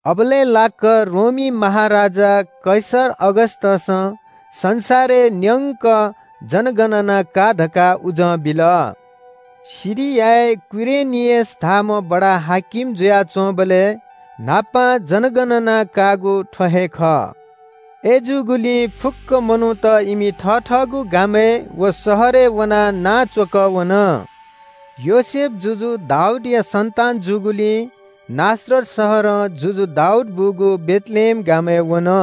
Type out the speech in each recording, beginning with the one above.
अबलय् लाक्‍क रोमी महाराजा कैसर अगस्‍टसं संसारय् न्‍यंक जनगणना का धकाः उजं बिल। सिरियाय् कुरेनियस धाःम्‍ह बडा-हाकिम जुयाच्‍वंबलय् न्‍हापां जनगणना काःगु थ्‍व हे खः। अय्‌जूगुलिं फुक्‍क मनूत इमि थथःगु गामय् व शहरय् वनाः नां च्‍वकः वन। योसेफ जुजु दाऊदया सन्‍तान जूगुलिं नासरत शहरं जुजु दाऊद बूगु बेथलेहेम गामय् वन।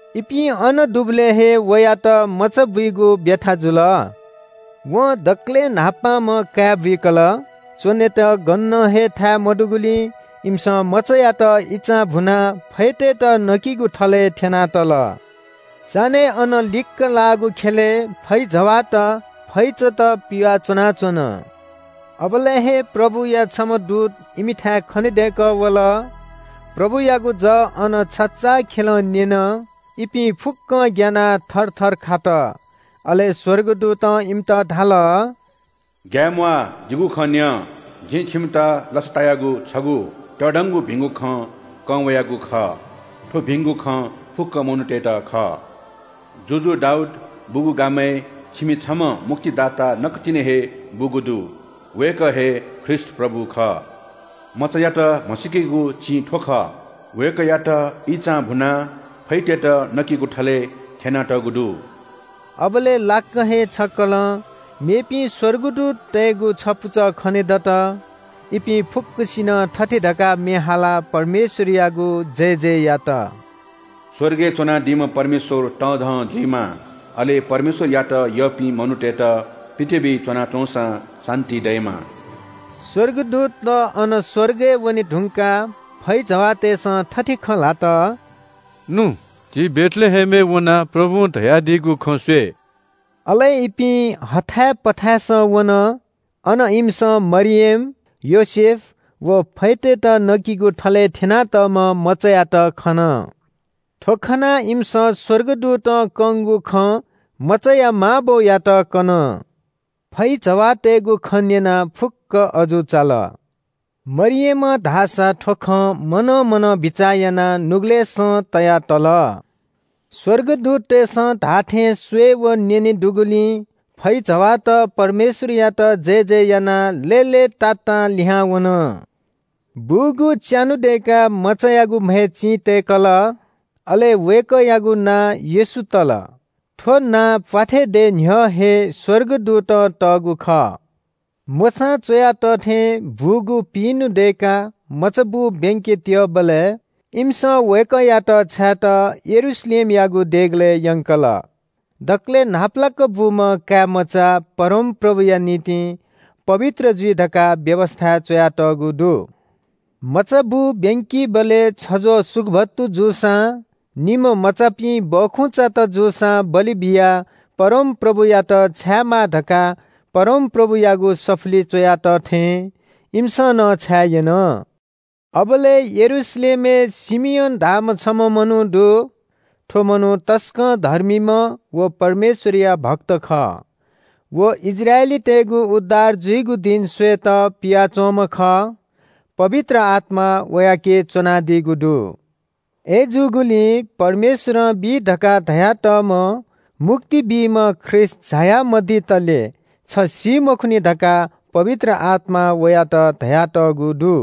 इपिं अन दुबलय् हे वयात मचाबुइगु ब्‍यथा जुल। वं दकलय् न्‍हापांम्‍ह काय् बुइकल। च्‍वनेत गनं हे थाय् मदुगुलिं इमिसं मचायात इचां भुनाः फैतय्‌त नकिगु थलय् थ्‍यनातल। चान्‍हय् अनं लिक्‍क लाःगु ख्‍यलय् फैजवाःत फैचात पिवाः च्‍वनाच्‍वन। अबलय् हे प्रभुया छम्‍ह दूत इमिथाय् खनेदय्‌कः वल। प्रभुयागु जः अन छचाःखेलं न्‍यन। इपिं फुक्‍कं ग्‍यानाः थरथर खात। अले स्‍वर्गदूतं इमित धाल – “ग्‍याये म्‍वाः। जिगु खँ न्‍यँ, जि छिमित लसतायागु छगू तःधंगु भिंगु खँ कं वयागु खः। थ्‍व भिंगु खँ फुक्‍क मनूतय्‌त खः। जुजु दाऊद बूगु गामय् छिमि छम्‍ह मुक्तिदाता नकतिनि हे बूगु दु। वय्‌कः हे ख्रीष्‍ट प्रभु खः। मचायात म्‍हसीकेगु चिं थ्‍व खः – वय्‌कःयात इचां भुनाः फैतय्‌त नकिगु थलय् थ्‍यनातःगु दु।” अबलय् लाक्‍क हे छक्‍कलं मेपिं स्‍वर्गदूततय्‌गु छपुचः खनेदत। इपिं फुक्‍कसिनं थथे धकाः म्‍ये हालाः परमेश्‍वरयागु जयजय यात – “स्‍वर्गय् च्‍वनादीम्‍ह परमेश्‍वर तःधं जुइमा। अले परमेश्‍वरयात यःपिं मनूतय्‌त पृथ्‍वीइ च्‍वनाच्‍वंसां शान्‍ति दयेमा।” स्‍वर्गदूतत अनं स्‍वर्गय् वने धुंकाः फैजवाःतय्‌सं थथे खँ ल्‍हात – “नु, झी बेथलेहेमय् वनाः प्रभुं धयादीगु खँ स्‍वये।” अले इपिं हथाय् पथासं वन। अन इमिसं मरियम, योसेफ व फैतय्‌त नकिगु थलय् थ्‍यनातःम्‍ह मचायात खन। थ्‍व खनाः इमिसं स्‍वर्गदूतं कंगु खँ मचाया मां बौयात कन। फैजवाःतय्‌गु खँ न्‍यनाः फुक्‍कं अजू चाल। मरियमं धाःसा थ्‍व खँ मनं मनं बिचाः यानाः नुगलय्‌सं तया तल। स्‍वर्गदूततय्‌सं धाःथें स्‍वये व न्‍यने दुगुलिं फैजवाःत परमेश्‍वरयात जयजय यानाः लय्‌तातां लिहां वन। बूगु च्‍यान्‍हु दय्‌काः मचायागु म्‍हय् चिं तय्‌कल। अले वय्‌कःयागु नां येशू तल। थ्‍व नां प्‍वाथय् दये न्‍ह्यः हे स्‍वर्गदूतं तःगु खः। मोशां च्‍वया तः थें बूगु पिइन्‍हु दय्‌काः मचाबू ब्‍यंके त्‍यःबलय् इमिसं वय्‌कःयात छायेत यरूशलेमयागु देगलय् यंकल। दकलय् न्‍हापालाक बूम्‍ह काय्‌मचा परमप्रभुया निंतिं पवित्र जुइ धकाः व्‍यवस्‍थाय् च्‍वयातःगु दु। मचाबू ब्‍यंकीबलय् छज्‍वः सुकुभत्तु जूसां निम्‍ह मचापिं बखुंचात जूसां बलि बियाः परमप्रभुयात छायेमाः धकाः परमप्रभुयागु सफुलिइ च्‍वया तः थें इमिसं नं छाये यन। अबलय् यरूशलेमय् शिमियोन धाःम्‍ह छम्‍ह मनू दु। थ्‍व मनू तसकं धर्मीम्‍ह व परमेश्‍वरया भक्त खः। व इस्राएलीतय्‌गु उद्धार जुइगु दिं स्‍वयेत पियाच्‍वंम्‍ह खः। पवित्र आत्‍मा वयाके च्‍वनादीगु दु। अय्‌जूगुलिं परमेश्‍वरं बी धकाः धयातःम्‍ह मुक्ति बीम्‍ह ख्रीष्‍ट झाया मदितले छ सी मखुनि धकाः पवित्र आत्‍मां वयात धयातःगु दु।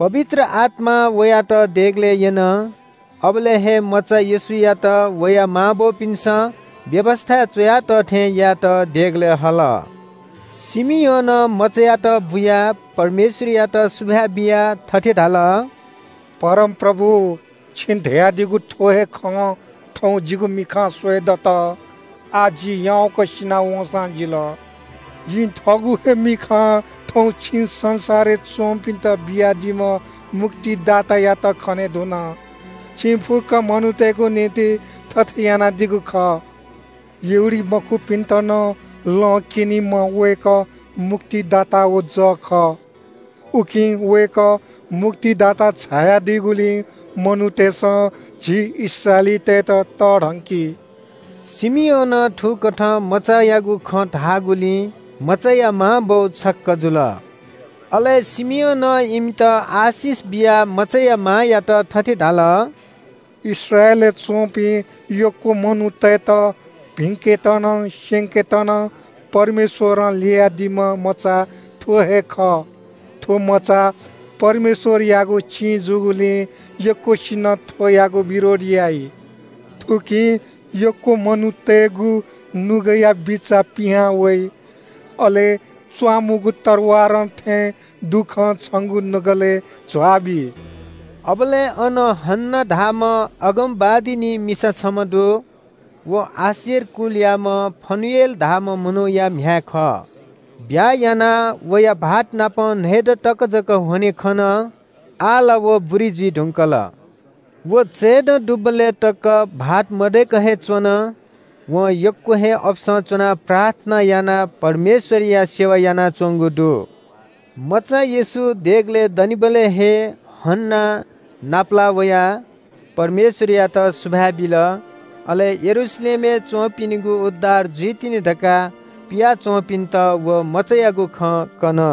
पवित्र आत्‍मां वयात देगलय् यन। अबलय् हे मचा येशूयात वया मांबौपिन्‍सं व्‍यवस्‍थाय् च्‍वया तः थें यायेत देगलय् हल। शिमियोनं मचायात बुयाः परमेश्‍वरयात सुभाय् बियाः थथे धाल – “परमप्रभु, छिं धयादीगु थ्‍व हे खँ थौं जिगु मिखां स्‍वयेदत। आः जि याउँक सिना वंसां जिल। जिं थःगु हे मिखां थौं छिं संसारय् च्‍वंपिन्‍त बियादीम्‍ह मुक्तिदातायात खने धुन। छिं फुक्‍क मनूतय्‌गु निंतिं थथे यानादीगु खः। यहूदीमखुपिन्‍त नं लँ क्‍यनीम्‍ह वय्‌कः मुक्तिदाता व जः खः। उकिं वय्‌कः मुक्तिदाता झायादीगुलिं मनूतय्‌सं झी इस्राएलीतय्‌त तःधंकी।” शिमियोनं थुकथं मचायागु खँ धाःगुलिं मचाया मांबौ छक्‍क जुल। अले शिमियोनं इमित आशिष बियाः मचाया मांयात थथे धाल – “इस्राएलय् च्‍वंपिं यक्‍व मनूतय्‌त भिंकेत नं स्‍यंकेत नं परमेश्‍वरं ल्‍ययादीम्‍ह मचा थ्‍व हे खः। थ्‍व मचा परमेश्‍वरयागु चिं जूगुलिं यक्‍वसिनं थ्‍वयागु विरोध याइ। थुकिं यक्‍व मनूतय्‌गु नुगःया बिचाः पिहां वइ। अले च्‍वामुगु तरवारं थें दुःखं छंगु नुगलय् झ्‍वाबी।” अबलय् अन हन्‍ना धाःम्‍ह अगमवादिनी मिसा छम्‍ह दु। व आशेर कुलयाम्‍ह फनुएल धाःम्‍ह मनूया म्‍ह्याय् खः। ब्‍याहा यानाः वया भाःतनाप न्‍हय्‌दँ तक जक ह्वने खन। आः ला व बुरी जुइ धुंकल। व चयप्‍यदँ दुबलय् तक भाःत मदय्‌कः हे च्‍वन। वं यक्‍व हे अपसं च्‍वनाः प्रार्थना यानाः परमेश्‍वरया सेवा यानाच्‍वंगु दु। मचा येशू देगलय् दनिबलय् हे हन्‍नां नापलाः वयाः परमेश्‍वरयात सुभाय् बिल। अले यरूशलेमय् च्‍वंपिनिगु उद्धार जुइतिनि धकाः पिया च्‍वंपिन्‍त व मचायागु खँ कन।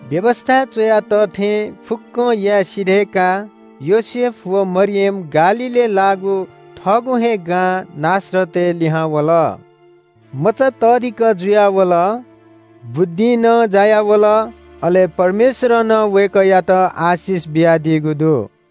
व्‍यवस्‍थाय् च्‍वया तः थें फुक्‍कं याये सिधय्‌काः योसेफ व मरियम गालीलय् लाःगु थःगु हे गां नासरतय् लिहां वल। मचा तःधिकः जुयावल। बुद्धिं नं जायावल, अले परमेश्‍वरं नं वय्‌कःयात आशिष बियादीगु दु।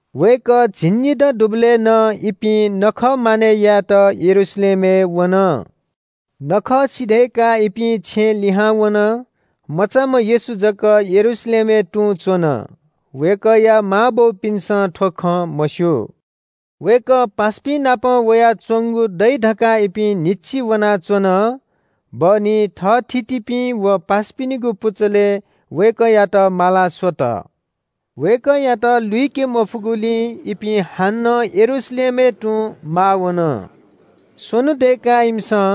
वय्‌कः झिंनिदँ दुबलय् नं इपिं नखः मानय् यायेत यरूशलेमय् वन। नखः सिधय्‌काः इपिं छेँ लिहां वन। मचाम्‍ह येशू जक यरूशलेमय् तुं च्‍वन। वय्‌कःया मांबौपिन्‍सं थ्‍व खँ मस्‍यू। वय्‌कः पासापिंनापं वयाच्‍वंगु दइ धकाः इपिं न्‍हिच्‍छि वनाच्‍वन। बहनी थःथितिपिं व पासापिनिगु पुचलय् वय्‌कःयात माला स्‍वत। वय्‌कःयात लुइके मफुगुलिं इपिं हानं यरूशलेमय् तुं माः वन। स्‍वन्‍हु दय्‌काः इमिसं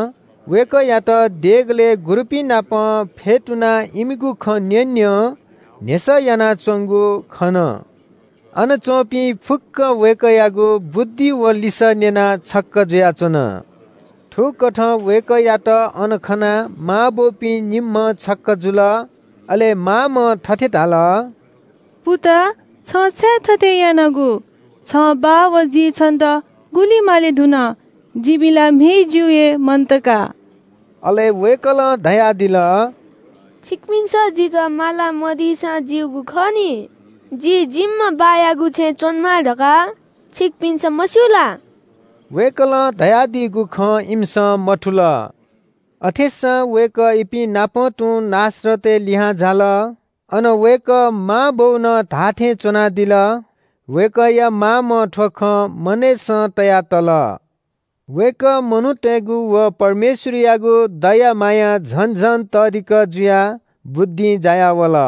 वय्‌कःयात देगलय् गुरुपिंनापं फ्‍यतुनाः इमिगु खँ न्‍यँन्‍यं, न्‍ह्यसः यानाच्‍वंगु खन। अन च्‍वंपिं फुक्‍क वय्‌कःयागु बुद्धि व लिसः न्‍यनाः छक्‍क जुयाच्‍वन। थुकथं वय्‌कःयात अन खनाः मांबौपिं निम्‍हं छक्‍क जुल। अले मांम्‍हं थथे धाल – “पुता, छं छाय् थथे यानागु? छं बाः व जिं छन्‍त गुलि माले धुन। जिमि ला म्‍हय् जिउ हे मन्‍त का।” अले वय्‌कलं धयादिल – “छिकपिन्‍सं जितः माला मदीसां ज्‍यूगु खः नि। जि जिम्‍ह बाःयागु छेँय् च्‍वनेमाः धकाः छिकपिन्‍सं मस्‍यू ला?” वय्‌कलं धयादीगु खँ इमिसं मथुल। अथेसां वय्‌कः इपिं नाप तुं नासरतय् लिहां झाल। अन वय्‌कः मांबौनं धाःथें च्‍वनादिल। वय्‌कःया मामं थ्‍व खँ मनय्‌सं तयातल। वय्‌कः मनूतय्‌गु व परमेश्‍वरयागु दया मायां झन झन तःधिकः जुयाः बुद्धिं जायावल।